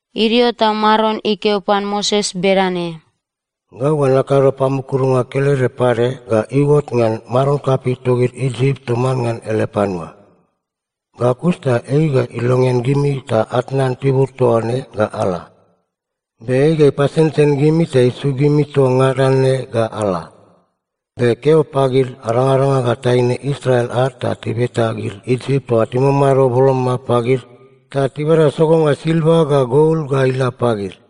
Idio ta Maron ikeo pan Moses bedane, “Gau ga nakado pamukurunga kelede pade ga iuot ngan maron kapei togid Isip toman ngan ele panua. Ga kus ta ei ga ilongean gimi ta atnan tibur toa ne ga ala. Be ei ga ipasensen gimi ta isuk gimi toa ngada ne ga ala. Be keo pagid arangaranga ga taine Israel ad ta tibeta gid Isip toa timamado boloma pagid ta tibada sogonga silva ga gol ga ila pagid.”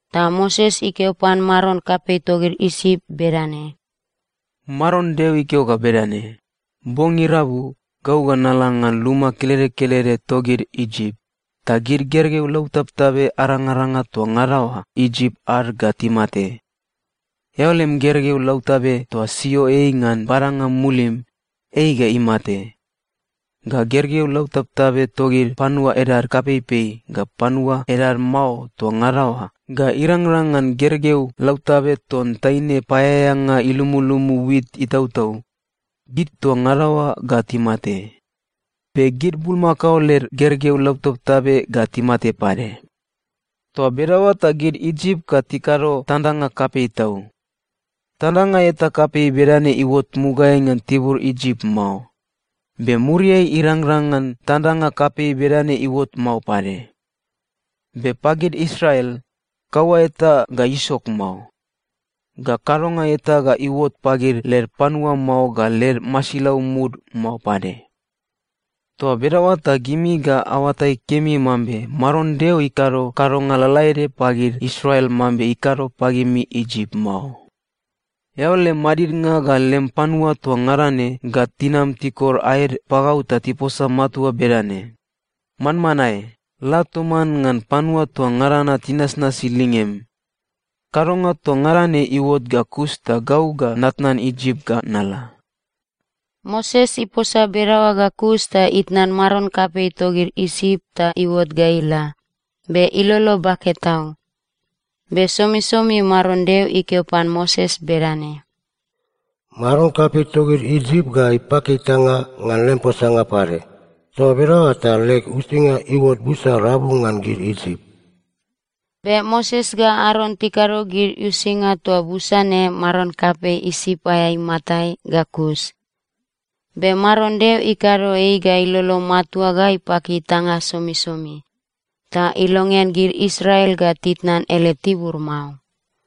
Ta Moses ikeo pan maron kapei togid Isip bedane, “Maron Deo ikeo ga bedane: Bong irabu, gau ga nala ngan luma kelede kelede togid Isip, ta gid gergeu lautabtabe arangaranga toa ngada oa Isip ad ga timate. Eao lem gergeu lautabe toa sio ei ngan badanga mulim, ei ga imate. Ga gergeu lautabtabe togid panua edad kapeipei ga panua edad mao toa ngada oa ga irangrang ngan gergeu lautabe ton taine paeaeanga ilumulumu wit itautau, gid toa ngada oa ga timate. Be gid bulmakao led gergeu lautabtabe ga timate pade. Toa bedaoa ta gid Isip ga tikado tandanga kapei tau. Tandanga eta kapei bedane iuot mugaeai ngan tibur Isip mao, be muriai irangrang ngan tandanga kapei bedane iuot mao pade. Be pagid Israel, kaua eta ga isok mao, ga kadonga eta ga iuot pagid led panua mao ga led masilau mud mao pade. Toa bedaoa ta gimi ga aoatai kemi mambe Maron Deo ikado kadonga lalaede pagid Israel mambe ikado pagimi Isip mao. Eao lem madidnga ga lem panua toa ngada ne ga tinam tikor aed pagau ta tiposa matua bedane, ‘Manmanae! La toman ngan panua toa ngada na tinasnasi lingem!’ Kadonga toa ngada ne iuot ga kus ta gau ga natnan Isip ga nala.” Moses iposa bedaoa ga kus ta itnan maron kapei togid Isip ta iuot ga ila, be ilolo bake tau. Be somisomi Maron Deo ikeo pan Moses bedane, “Maron kapei togid Isip ga ipaki itanga ngan lem posanga pade. Toa bedaoa ta leg uisinga iuot busa rabu ngan gid Isip.” Be Moses ga Aron tikado gid uisinga toa busa ne maron kapei Isip aea imatai ga kus. Be Maron Deo ikado ei ga ilolo matua ga ipaki itanga somisomi, ta ilongean gid Israel ga titnan ele tibur mao.